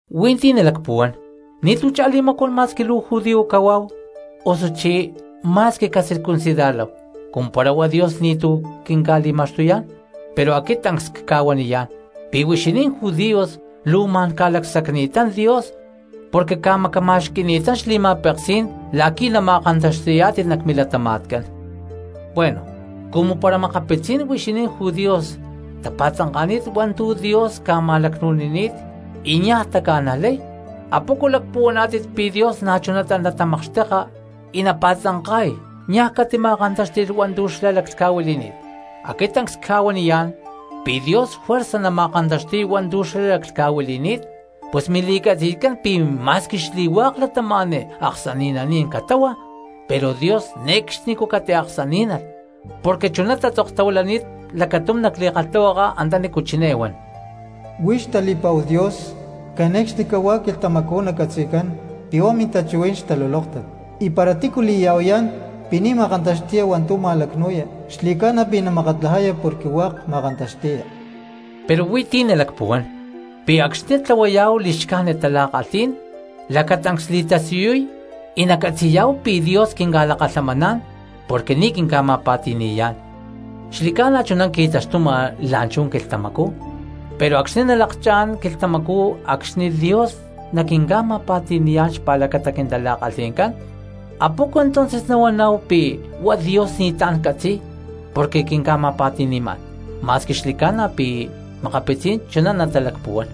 Hui̠nti̠ nalacpuhuán: ¿Ni̠tu̠ chá li̠macuán ma̠squi luu judío cahuáhu osuchí ma̠squi cacircuncidarláhu, cumu para huá Dios ni̠tu̠ quinca̠li̠ma̠xtuyá̠n? Pero aquit tancs cca̠huaniyá̠n pi̠ huixinín judíos luu ma̠n ca̠lacsacni̠tán Dios porque ca̠macama̠xqui̠ni̠tán xli̠ma̠peksí̠n la̠qui̠ nama̠kantaxti̠yá̠tit nac milatama̠tcán. Bueno, cumu para makapitzí̠n huixinín judíos tapa̠tzanka̠ni̠t hua̠ntu̠ Dios ca̠ma̠lacnu̠nini̠t y niaj taca̠najlay, ¿apoco lacpuhuaná̠tit pi̠ Dios na̠chunatá natamakxteka y napa̠tzanka̠y niaj catima̠kantáxti̠lh hua̠ntu̠ xlá laclhca̠huili̠ni̠t? Aquit tancs cca̠huaniyá̠n pi̠ Dios juerza nama̠kantaxti̠y hua̠ntu̠ xlá laclhca̠huili̠ni̠t; pus mili̠catzi̠tcán pi̠ ma̠squi xli̠hua̠k cristianos aksani̠naní̠n catáhua, pero Dios ne̠cxnicú catiaksaní̠nalh. Porque chuná tatzoktahuilani̠t lacatum nac li̠kalhtahuaka antanícu chiné huan: Huix tali̠pa̠hu Dios, cane̠cxnicahuá quilhtamacú nacatzi̠cán pi̠ huá mintachuhuí̠n xtalulóktat, y para tícu li̠ya̠huayá̠n pi̠ ni̠ ma̠kantaxti̠ya hua̠ntu̠ ma̠lacnu̠ya xli̠ca̠na pi̠ namakatlajaya porque hua̠k ma̠kantaxti̠ya. Pero huí ti̠ nalacpuhuán, pi̠ acxni̠ tlahuayá̠hu li̠xcájnit tala̠kalhí̠n lacatancs li̠tasiyuy y nacatzi̠yá̠hu pi̠ Dios quinca̠lakalhamaná̠n porque ni̠ quinca̠ma̠pa̠ti̠ni̠yá̠n. Xli̠ca̠na chuná qui̠taxtuma la̠nchú quilhtamacú pero acxni̠ nalakchá̠n a̠má quilhtamacú acxni̠ Dios juerza naquinca̠ma̠pa̠ti̠ni̠yá̠n xpa̠lacata quintala̠kalhí̠n, ¿apoco entonces nahuaná̠hu pi̠ huá Dios ni̠tlá̠n catzi̠y porque quinca̠ma̠pa̠ti̠ni̠yá̠n? (Ma̠squi xli̠ca̠na pi̠ makapitzí̠n chuná natalacpuhuán.)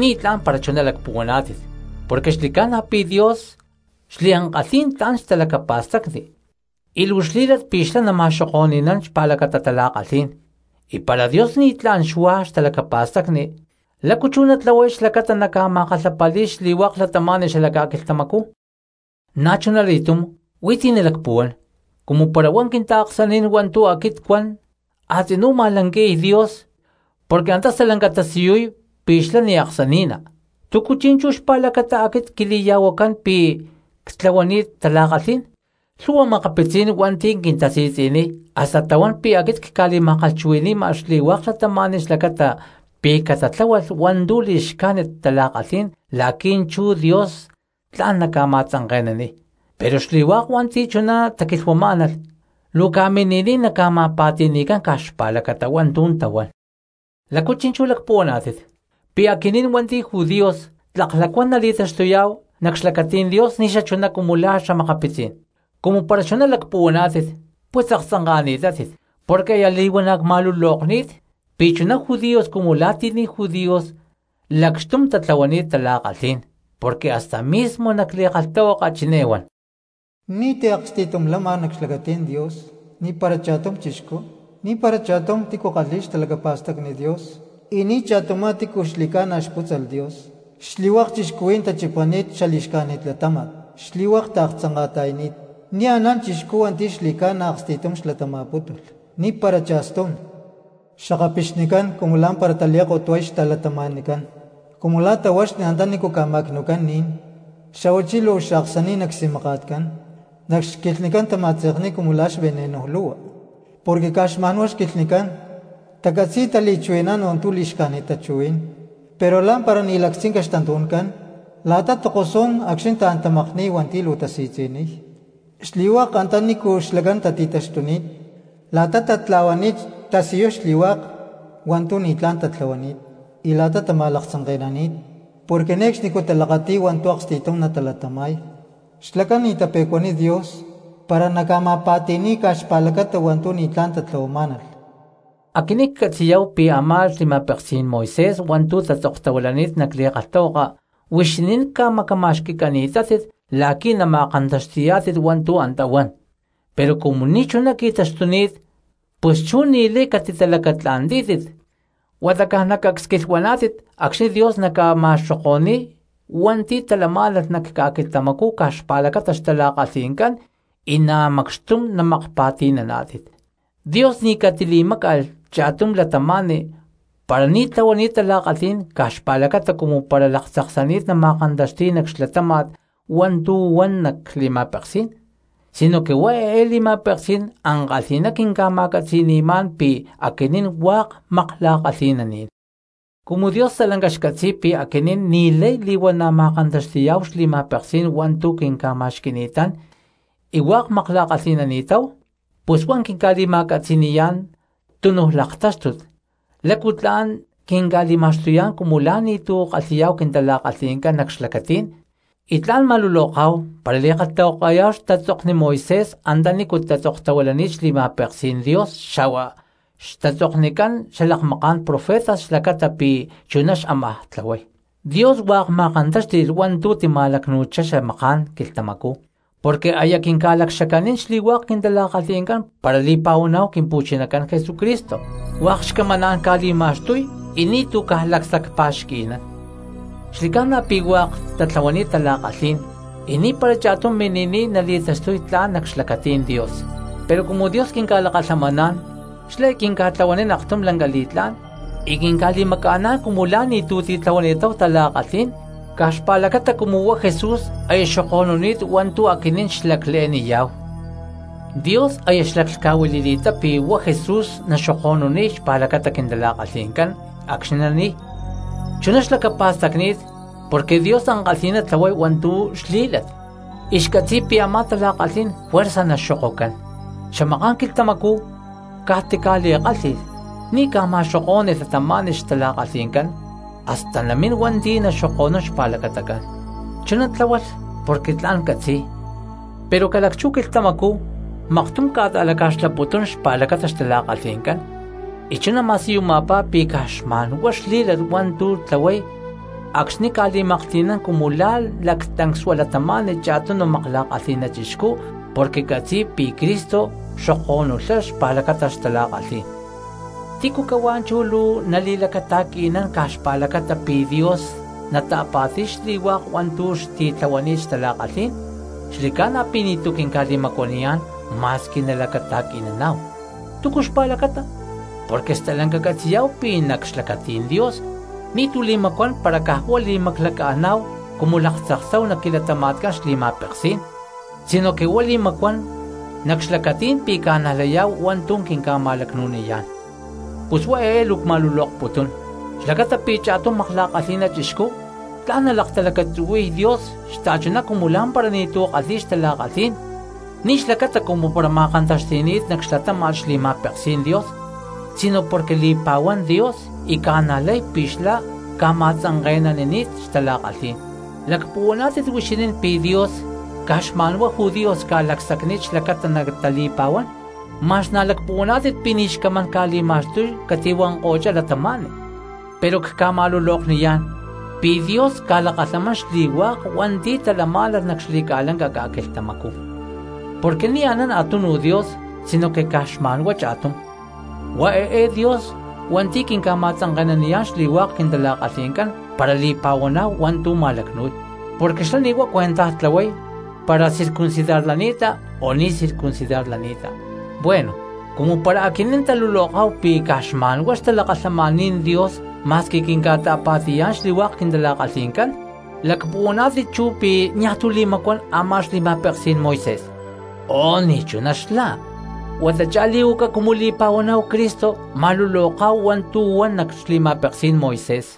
Ni̠tlá̠n para chuná lacpuhuaná̠tit porque xli̠ca̠na pi̠ Dios xliankalhí̠n tla̠n xtalacapa̠stacni y luu xlí̠lat pi̠ xlá nama̠xoko̠ni̠nán xpa̠lacata tala̠kalhí̠n y para Dios ni̠tlá̠n xuá xtalacapa̠stacni, ¿lácu chú natlahuay xlacata naca̠ma̠kalhapali̠y xli̠hua̠k cristianos xala ca̠quilhtamacú? Na̠chunali̠túm huí ti̠ nalacpuhuán; cumu para huá quintaaksaní̠n hua̠ntu̠ aquit cuan a̠tzinú ma̠lanqui̠y Dios porque antá stalanca tasiyuy pi̠ xlá ni̠ aksani̠ná, ¿túcu chi̠nchú xpa̠lacata aquit quili̠ya̠huacán pi̠ ctlahuani̠t tala̠kalhí̠n? Makapitzí̠n cristianos hua̠nti̠ luu quintasi̠tzi̠niy hasta tahuán pi̠ aquit cca̠li̠ma̠kalhchuhui̠ni̠ma xli̠hua̠k cristianos xlacata pi̠ catatláhualh hua̠ntu̠ li̠xcájnit tala̠kalhí̠n la̠qui̠ chú Dios tla̠n naca̠ma̠tzanke̠naniy, pero xli̠hua̠k hua̠nti̠ chuná taquilhuamá̠nalh luu ca̠mini̠niy naca̠ma̠pa̠ti̠ni̠cán caj xpa̠lacata hua̠ntu̠ tahuán. ¿Lácu chi̠nchú lacpuhuaná̠tit? ¿Pi̠ aquinín hua̠nti̠ judíos tlak lacuán cristianos nali̠taxtuyá̠hu nac xlacatí̠n Dios ni̠xachuná cumu la̠ xa̠makapitzí̠n cristianos? ¡Cumu para chuná lacpuhuaná̠tit, pus aktzanka̠ni̠tátit! Porque aya li̠huana̠ cma̠lulokni̠t pi̠ chuná judíos cumu la̠ ti̠ ni̠ judíos lacxtum tatlahuani̠t tala̠kalhí̠n. Porque hasta mismo nac li̠kalhtahuaka chiné huan: Ni̠ti̠ aksti̠tum lama nac xlacatí̠n Dios, ni̠para cha̠stum cristiano. Ni̠para cha̠tum tícu kalhi̠y xtalacapa̠stacni Dios, y ni̠cha̠tumá tícu xli̠ca̠na xpútzalh Dios. Xli̠hua̠k cristianos tachipani̠t xali̠xcájnit latáma̠t, xli̠hua̠k taaktzanka̠ta̠yani̠t. Ni̠ anán cristiano hua̠nti̠ xli̠ca̠na aksti̠tum xlatama̠pútulh, ¡ni̠para cha̠stum! Xakapixnicán cumu la̠mpara tali̠kotuay xta̠cristianoscán, cumu la̠ tahuaxni antaní ca̠ma̠cnu̠cán ni̠n, xa̠huachí luu xaaksani̠na csi̠maka̠tcán, nac xquilhnicán tama̠tze̠kni̠t cumu la̠ xveneno lu̠hua. Porque caj xma̠nhuá xquilhnicán tacatzi̠y tali̠chuhui̠nán hua̠ntu̠ li̠xcájnit tachuhuí̠n. Pero lá̠mpara ni̠ lactzinca xtantu̠ncán la̠ta takosnún acxni̠ taán tamakníy hua̠nti̠ luu tasi̠tzi̠niy. Xli̠hua̠k antanícu xlacán tati̠taxtuni̠t la̠ta tatla̠huani̠t tasiyuy xli̠hua̠k hua̠ntu̠ ni̠tlá̠n tatlahuani̠t y la̠ta tama̠laktzanke̠nani̠t. Porque ne̠cxnicú talakati̠y hua̠ntu̠ aksti̠tum natalatama̠y. Xlacán ni̠ tape̠cuaniy Dios para naca̠ma̠pa̠ti̠ni̠y caj xpa̠lacata hua̠ntu̠ ni̠tlá̠n tatlahuamá̠nalh. Aquinín catzi̠yá̠hu pi̠ a̠má xli̠ma̠peksí̠n Moisés hua̠ntu̠ tatzoktahuilani̠t nac li̠kalhtahuaka, huixinín ca̠macama̠xqui̠cani̠tátit la̠qui̠ nama̠kantaxti̠yá̠tit hua̠ntu̠ antá huan, pero cumu ni̠chuná qui̠taxtuni̠t pus chú ni̠lay catitalacatla̠ntí̠tit huata caj nacacsquilhuaná̠tit acxni̠ Dios naca̠ta̠tlahuay cuenta xli̠hua̠k cristianos hua̠nti̠ talamá̠nalh ca̠quilhtamacú caj xpa̠lacata xtala̠kalhi̠ncán y na̠ macxtum namakpa̠ti̠naná̠tit. Dios ni̠ catili̠máca̠lh cha̠tum cristiano para ni̠ tlahuani̠t tala̠kalhí̠n caj xpa̠lacata cumu para laktzaksani̠t nama̠kantaxti̠y nac xlatáma̠t hua̠ntu̠ huan nac li̠ma̠peksí̠n, sinoque huá eé li̠ma̠peksí̠n ankalhi̠ná quinca̠ma̠catzi̠ni̠má̠n pi̠ aquinín hua̠k makla̠kalhi̠naní̠n. Cumu Dios stalanca xcatzi̠y pi̠ aquinín ni̠lay li̠huana̠ ma̠kantaxti̠yá̠hu xli̠ma̠peksí̠n hua̠ntu̠ quinca̠ma̠xqui̠ni̠tán y hua̠k makla̠kalhi̠nani̠táhu, pus huá quinca̠li̠ma̠catzi̠ni̠yá̠n tunu laktáxtut lácu tla̠n quinca̠li̠ma̠xtuyá̠n cumu la̠ ni̠tu̠ kalhi̠yá̠hu quintala̠kalhi̠ncán nac xlacatí̠n, y tla̠n ma̠luloká̠hu para li̠kalhtahuakayá̠hu a̠má xlibro Moisés antanícu tatzoktahuilani̠t xli̠ma̠peksí̠n Dios xa̠hua xli̠brojcán xalakmaká̠n profetas xlacata pi̠ chuná xámaj tlahuay. Dios hua̠k ma̠kantáxti̠lh hua̠ntu̠ tima̠lacnu̠chá xamaká̠n quilhtamacú porque aya quinca̠lacxacanín xli̠hua̠k quintala̠kalhi̠ncán para li̠pa̠huaná̠hu Quimpu̠chinacán Jesucristo, hua̠k xcamaná̠n ca̠li̠ma̠xtuy y ni̠tu̠ caj lacsacpa̠xqui̠nán. Porque xli̠ca̠na pi̠ xli̠hua̠k cristianos tatlahuani̠t tala̠kalhí̠n y niajpara cha̠tum mini̠niy nali̠taxtuy tla̠n cristiano nac xlacatí̠n Dios. Pero cumu Dios quinca̠lakalhamaná̠n xlá quinca̠tlahuanín aktum lanca li̠tlá̠n y quinca̠li̠maca̠ná̠n cumu la̠ lacuán cristianos hua̠nti̠ ni̠ tatlahuani̠t tala̠kalhí̠n caj xpa̠lacata cumu huá Jesús aya xoko̠nuni̠t hua̠ntu̠ aquinín xlacle̠niyá̠hu. Dios aya xlaclhca̠huili̠ni̠ttá pi̠ huá Jesús naxoko̠nuniy xpa̠lacata quintala̠kalhi̠ncán acxni̠ nani̠y. Chuná xlacapa̠stacni̠t porque Dios ankalhi̠ná tlahuay hua̠ntu̠ xli̠lat y xcatzi̠y pi̠ a̠má tala̠kalhí̠n juerza naxoko̠nuncán. Xamaká̠n quilhtamacú caj tili̠kálhi̠lh ni̠ ca̠ma̠xokó̠ni̠lh cristianos xtala̠kalhi̠ncán, hasta namín hua̠nti̠ naxoko̠nún xpa̠lacatacán. Chuná tláhualh porque tla̠n catzi̠y, pero ca̠lacchú quilhtamacú maktum ca̠ta̠laca̠xlaputún cristianos xpa̠lacata xtala̠kalhi̠ncán, y chuná ma̠siyuma̠pá pi̠ caj xma̠nhuá xli̠lat hua̠ntu̠ tlahuay acxni̠ ca̠li̠maklhti̠nán cumu la̠ tancsua cristiano cha̠tum makla̠kalhi̠na chixcú porque catzi̠y pi̠ Cristo xoko̠nulhá xpa̠lacata xtala̠kalhí̠n. ¿Tícu cahuá chú luu nali̠lacata̠qui̠nán caj xpa̠lacata pi Dios nata̠pa̠ti̠y xli̠hua̠k hua̠ntu̠ xti̠tlahuani̠t xtala̠kalhí̠n? ¡Xli̠ca̠na pi̠ ni̠tu̠ quinca̠li̠macuaniyá̠n ma̠squi nalacata̠qui̠naná̠hu! ¿Túcu xpa̠lacata? Porque stalanca catzi̠yá̠hu pi̠ nac xlacatí̠n Dios ni̠tu̠ li̠macuán para caj huá li̠maclaca̠ná̠hu cumu laktzaksáhu nac quilatama̠tcán xli̠ma̠peksí̠n, sinoque huá li̠macuán nac xlacatí̠n pi̠ ca̠najlayá̠hu hua̠ntu̠ quinca̠ma̠lacnu̠niyá̠n. Pus huá eé luu cma̠lulokputún xlacata pi̠ cha̠tum makla̠kalhi̠na chixcú tla̠n nalaktalacatzuhui̠y Dios xta̠chuná cumu lá̠mpara ni̠tu̠ kalhi̠y xtala̠kalhí̠n, ni̠ xlacata cumu para ma̠kantaxti̠ni̠t nac xlatáma̠t xli̠ma̠peksí̠n Dios sino porque li̠pa̠huán Dios y ca̠najlay pi̠ xlá ca̠ma̠tzanke̠nanini̠t xtala̠kalhí̠n. ¿Lacpuhuaná̠tit huixinín pi̠ Dios caj xma̠nhuá judíos ca̠lacsacni̠t xlacata natali̠pa̠huán? ¿Ma̠x na̠ lacpuhuaná̠tit pi̠ ni̠ xcamaná̠n ca̠li̠ma̠xtuy catihuanko̠chá cristianos? ¡Pero cca̠ma̠lulokniyá̠n pi̠ Dios ca̠lakalhamán xli̠hua̠k cristianos hua̠nti̠ talamá̠nalh nac xli̠ca̠lanca ca̠quilhtamacú! Porque ni̠ anán a̠túnuj Dios sinoque caj xma̠nhuá cha̠tum, huá eé Dios hua̠nti̠ quinca̠ma̠tzanke̠naniyá̠n xli̠hua̠k quintala̠kalhi̠ncán para li̠pa̠huaná̠hu hua̠ntu̠ ma̠lacnu̠y, porque xlá ni̠ huá cuentaj tlahuay para circuncidarlani̠ta o ni̠ circuncidarlani̠ta. Bueno, cumu para aquinín taluloká̠hu pi̠ caj xma̠nhuá xtalakalhamaní̠n Dios ma̠squi quinca̠ta̠pa̠ti̠yá̠n xli̠hua̠k quintala̠kalhi̠ncán, ¿lacpuhuaná̠tit chú pi̠ niaj tu̠ li̠macuán a̠má xli̠ma̠peksí̠n Moisés? ¡Oh, ni̠chuná xla! Huata chá li̠huacá cumu li̠pa̠huaná̠hu Cristo ma̠luloká̠hu hua̠ntu̠ huan nac xli̠ma̠peksí̠n Moisés.